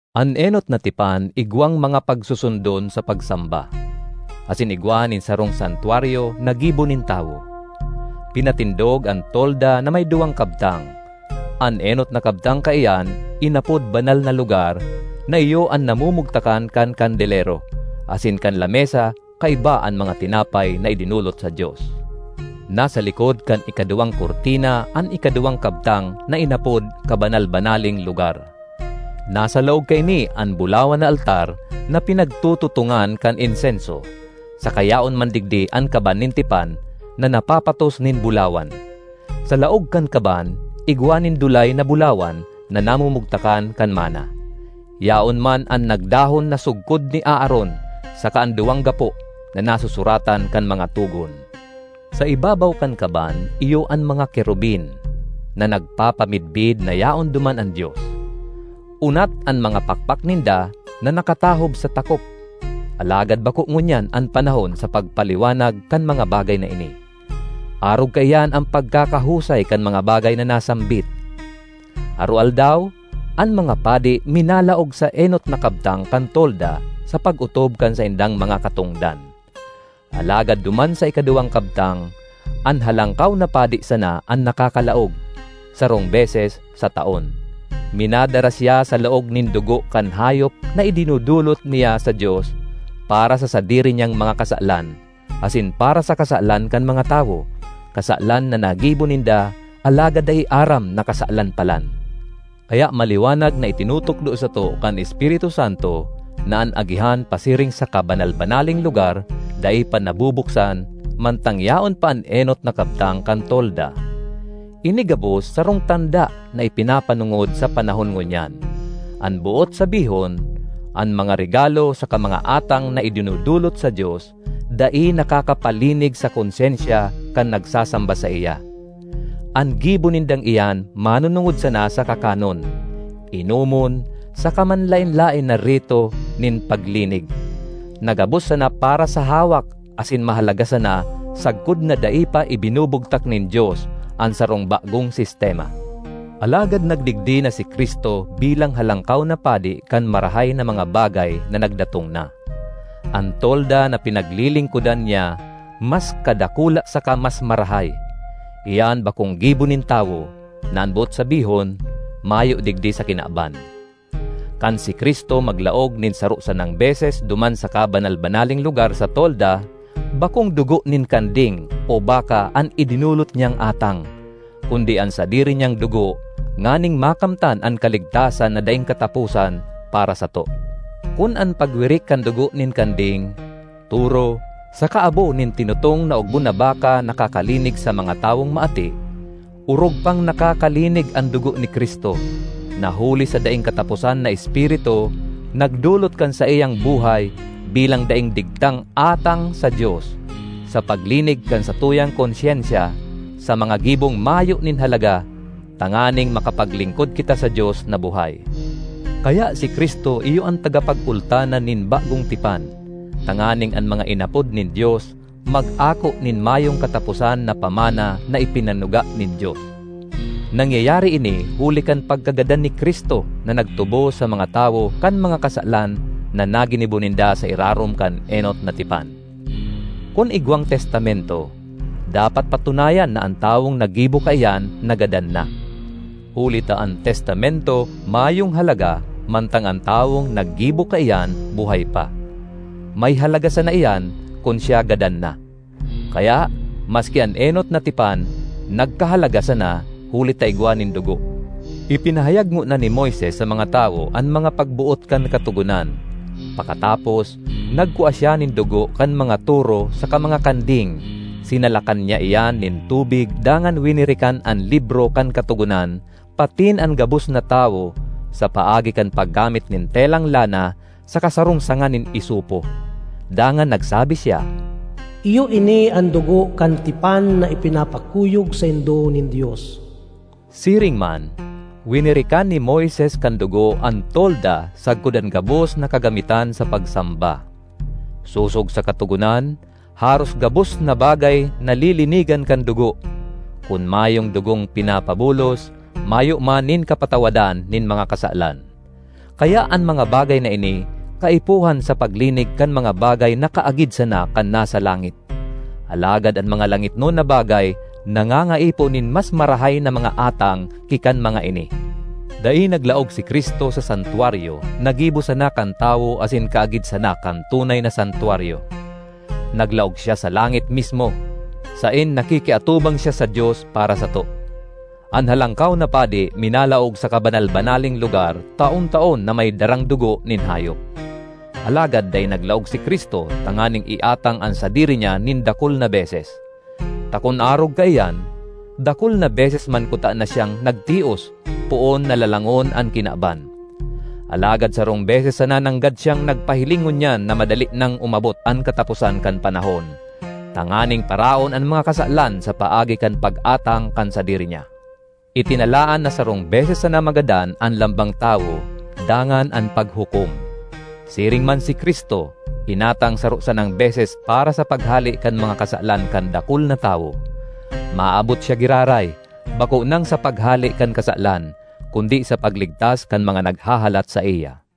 An enot na tipan igwang mga pagsusundon sa pagsamba, asin igwa nin sarong santwaryo na gibo nin tawo. Pinatindog an tolda na may duwang kabtang, an enot na kabtang kaiyan inapod Banal na Lugar na iyo an namumugtakan kan kandelero, asin kan lamesa kaiba an mga tinapay na idinolot sa Dios. Nasa likod kan ikaduwang kurtina an ikaduwang kabtang na inapod Kabanal-banaleng Lugar. Nasa laog kaini an bulawan na altar na pinagtututongan kan insenso, saka yaon man digdi an Kaban nin Tipan na napapatos nin bulawan. Sa laog kan kaban igwa nin dulay na bulawan na namumugtakan kan manna; yaon man an nagdahon na sugkod ni Aaron saka an duwang gapo na nasusuratan kan mga togon. Sa ibabaw kan kaban iyo an mga kerubin, na nagpapamidbid na yaon duman an Dios. Unat an mga pakpak ninda na nakatahob sa takop. Alagad bako ngunyan an panahon sa pagpaliwanag kan mga bagay na ini. Arog kaiyan an pagkakahusay kan mga bagay na nasambit. Aroaldaw, an mga padi minalaog sa enot na kabtang kan tolda sa pag-otob kan saindang mga katongdan. Alagad duman sa ikaduwang kabtang, an Halangkaw na Padi sana an nakakalaog, sarong beses sa taon. Minadara siya sa laog nin dugo kan hayop na idinodolot niya sa Dios para sa sadiri niyang mga kasalan asin para sa kasalan kan mga tawo, kasalan na nagibo ninda alagad dai aram na kasalan palan. Kaya maliwanag na itinutukdo sato kan Espiritu Santo na an agihan pasiring sa Kabanal-banaleng Lugar dai pa nabubuksan mantang yaon pa an enot na kabtang kan tolda. Ini gabos sarong tanda na ipinapanongod sa panahon ngunyan. An boot sabihon, an mga regalo saka mga atang na idinodolot sa Dios dai nakakapalinig sa konsyensya kan nagsasamba saiya. An gibo nindang iyan manonongod sana sa kakanon, inomon, saka manlaen-laen na rito nin paglinig, na gabos sana para sa hawak asin mahalaga sana sagkod na dai pa ibinubugtak nin Dios an sarong bagong sistema. Alagad nagdigdi na si Cristo bilang Halangkaw na Padi kan marahay na mga bagay na nagdatong na. An tolda na pinaglilingkodan niya mas kadakula saka mas marahay; iyan bakong gibo nin tawo, na an boot sabihon, mayo digdi sa kinaban. Kan si Cristo maglaog nin saro sanang beses duman sa Kabanal-banaleng Lugar sa tolda, bakong dugo nin kanding o baka an idinolot niyang atang, kundi an sadiri niyang dugo nganing makamtan an kaligtasan na daing kataposan para sato. Kun an pagwirik kan dugo nin kanding, toro saka abo nin tinutong na ogbon na baka nakakalinig sa mga tawong maati, orog pang nakakalinig an dugo ni Cristo, na huli sa daing kataposan na Espiritu, nagdolot kan saiyang buhay bilang daing digtang atang sa Dios, sa paglinig kan satuyang konsyensya sa mga gibong mayo nin halaga tanganing makapaglingkod kita sa Dios na buhay. Kaya si Cristo iyo an tagapagultanan nin bagong tipan, tanganing an mga inapod nin Dios mag-ako nin mayong kataposan na pamana na ipinanuga nin Dios. Nangyayari ini huli kan pagkagadan ni Cristo na nagtubos sa mga tawo kan mga kasalan na naginibo ninda sa irarom kan enot na tipan. Kun igwang testamento, dapat patunayan na an tawong naggibo kaiyan nagadan na. Huli ta an testamento mayong halaga mantang an tawong naggibo kaiyan buhay pa; may halaga sana iyan kun siya gadan na. Kaya, maski an enot na tipan nagkahalaga sana huli ta igwa nin dugo. Ipinahayag ngona ni Moises sa mga tawo an mga pagboot kan Katogonan. Pakatapos, nagkua siya nin dugo kan mga toro saka mga kanding, sinalakan niya iyan nin tubig dangan winirikan an libro kan Katogonan patin an gabos na tawo sa paagi kan paggamit nin telang lana saka sarong sanga nin isopo. Dangan nagsabi siya, “Iyo ini an dugo kan tipan na ipinapakuyog saindo nin Dios.” Siring man, winirikan ni Moises kan dugo an tolda sagkod an gabos na kagamitan sa pagsamba. Sosog sa Katogonan, haros gabos na bagay nalilinigan kan dugo; kun mayong dugong pinapabulos, mayo man nin kapatawadan nin mga kasalan. Kaya an mga bagay na ini kaipuhan sa paglinig kan mga bagay na kaagid sana kan nasa langit; alagad an mga langitnon na bagay nangangaipo nin mas marahay na mga atang ki kan mga ini. Dai naglaog si Cristo sa Santwaryo na gibo sana kan tawo asin kaagid sana kan tunay na santwaryo; naglaog siya sa langit mismo, saen nakikiatubang siya sa Dios para sato. An Halangkaw na Padi minalaog sa Kabanal-banaleng Lugar taon-taon na may darang dugo nin hayop. Alagad dai naglaog si Cristo tanganing iatang an sadiri niya nin dakul na beses. Ta kun arog kaiyan, dakul na beses man kutana siyang nagtios poon na lalangon an kinaban. Alagad sarong beses sana nanggad siyang nagpahiling ngunyan na madali nang umabot an kataposan kan panahon, tanganing paraon an mga kasalan sa paagi kan pag-atang kan sadiri niya. Itinalaan na sarong beses sana magadan an lambang tawo, dangan an paghukom. Siring man si Cristo inatang saro sanang beses para sa paghale kan mga kasalan kan dakul na tawo. Maabot siya giraray, bako nang sa paghale kan kasalan, kundi sa pagligtas kan mga naghahalat saiya.